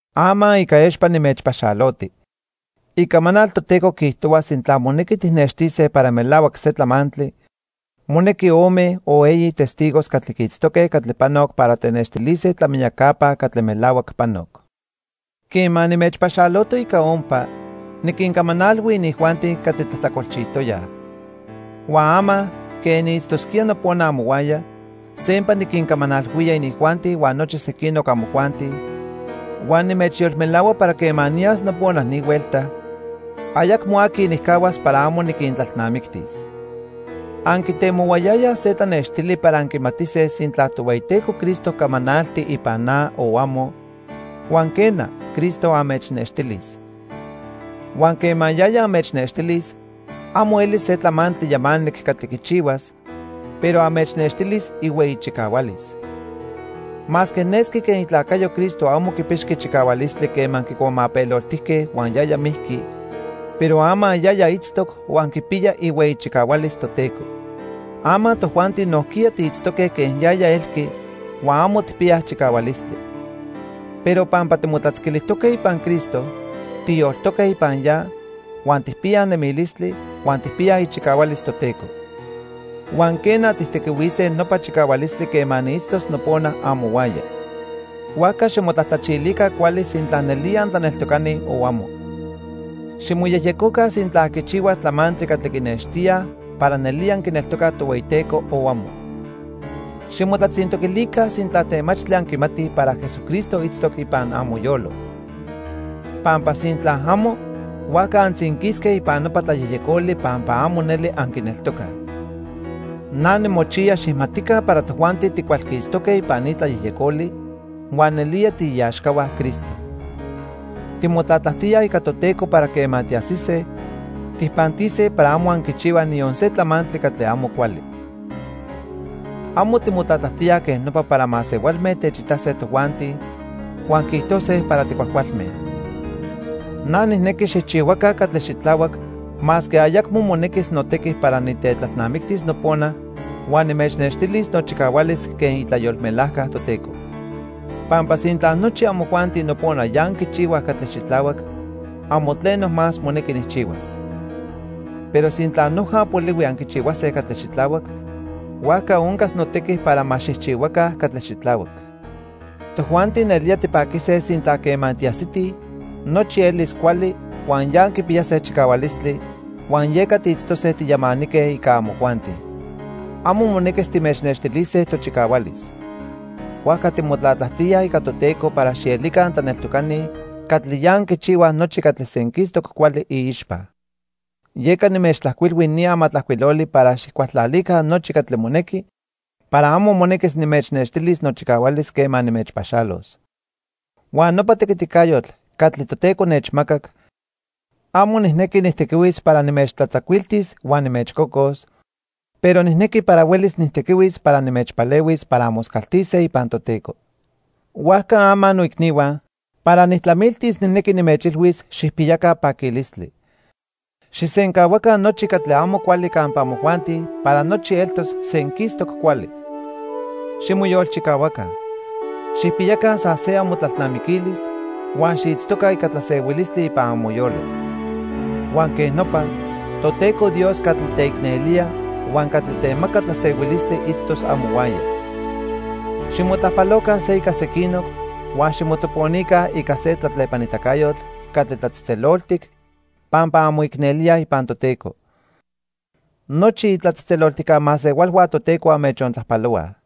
Ama ica expa nimechpaxaloti. Icamanal Toteco quiijtohua sintla monequi tijnextise para melahuac se tlamantli, monequi ome o eyi testigos catli quiitztoque catli panoc para tenextilise tlamiyacapa catli melahuac panoc. Quema nimechpaxaloto ica ompa, niquincamanalhui inijuanti catli tlajtlacolchijtoyaj. Huan ama, quen niitztosquía nopona amohuaya, sempa niquincamanalhuía inijuanti huan nochi sequinoc amojuanti, huan nimechyolmelahua para quema niyas nopona ni huelta, ayacmo aqui nijcahuas para amo niquintlalnamictis. Anquitemohuayayaj se tlanextili para anquimatise sintla Tohueyiteco Cristo camanalti ipan na o amo, huan quena, Cristo anmechnextilis. Huan quema yaya anmechnextilis amo elis se tlamantli yamanic catli quichihuas, pero anmechnextilis ihueyi chicahualis. Masque nesqui quen itlacayo Cristo amo quipixqui chicahualistli quema quicuamapeloltijque huan yaya mijqui, pero ama yaya itztoc huan quipiya ihueyi chicahualis Toteco. Ama tojuanti nojquiya tiitztoque quen yaya elqui huan amo tijpiyaj chicahualistli. Pero pampa timotlatzquilijtoque ipan Cristo, tiyoltoque ipan ya, huan tijpiyaj nemilistli, huan tijpiyaj ichicahualis Toteco. Huan quena, tijtequihuise nopa chicahualistli quema niitztos nopona amohuaya. Huajca ximotlajtlachilica cuali sintla nelía antlaneltocani o amo. Ximoyejyecoca sintla anquichihuaj tlamantli catli quinextíaj para nelía anquineltocaj Tohueyiteco o amo. Ximotlatzintoquilica sintla temachtli anquimatij para Jesucristo itztoc ipan amoyolo. Pampa sintla amo, huajca antzinquisque ipan nopa tlayejyecoli pampa amo neli anquineltocaj. Na nimochiya xijmatica para tojuanti ticualquistoque ipan ni tlayejyecoli huan nelía tiiaxcahua Cristo. Timotlatlajtíaj ica Toteco para quema tiajsise, tijpantise para amo anquichihuaj niyon se tlamantli catli amo cuali. Amo timotlatlajtíaj quej nopa para masehualme techitase tojuanti huan quiijtose para ticuajcualme. Na nijnequi xijchihuaca catli xitlahuac masque ayacmo monequis notequi para nitetlalnamictis nopona huan nimechnextilis nochicahualis quen itlayolmelajca Toteco. Pampa sintla nochi amojuanti nopona ya anquichihuaj catli xitlahuac, amo tleno más monequi nijchihuas. Pero sintla noja polihui anquichihuase catli xitlahuac, huajca oncas notequi para ma xijchihuaca catli xitlahuac. Tojuanti nelía tipaquise sintla quema tiajsitij, nochi elis cuali huan ya anquipiyase chicahualistli huan yeca tiitztose tiyamanique ica amojuanti. Amo monequis timechnextilise tochicahualis. Huajca timotlatlajtíaj ica Toteco para xielica antlaneltocani catli ya anquichihuaj nochi catli senquistoc cuali iixpa. Yeca nimechtlajcuilhui ni amatlajcuiloli para xijcualtlalica nochi catli monequi para amo monequis nimechnextilis nochicahualis quema nimechpaxalos. Huan nopa tequiticayotl catli Toteco nechmacac, amo nijnequi nijtequihuis para nimechtlatzacuiltis huan nimechcocos, pero nijnequi para huelis nijtequihuis para nimechpalehuis para anmoscaltise ipan Toteco. Huajca ama, noicnihua, para nijtlamiltis nijnequi nimechilhuis xijpiyaca paquilistli. Xijsencahuaca nochi catli amo cuali campa amojuanti para nochi eltos senquistoc cuali. Ximoyolchicahuaca. Xijpiyaca san se amotlalnamiquilis huan xiitztoca ica tlasehuilistli ipan amoyolo. Huan quej nopa, Toteco Dios catli teicnelía huan catli temaca tlasehuilistli itztos amohuaya. Ximotlajpaloca se ica sequinoc huan ximotzoponica ica se tlatlepanitacayotl catli tlatzejtzeloltic pampa anmoicnelíaj ipan Toteco. Nochi itlatzejtzeloltijca masehualhua Toteco anmechontlajpalohuaj.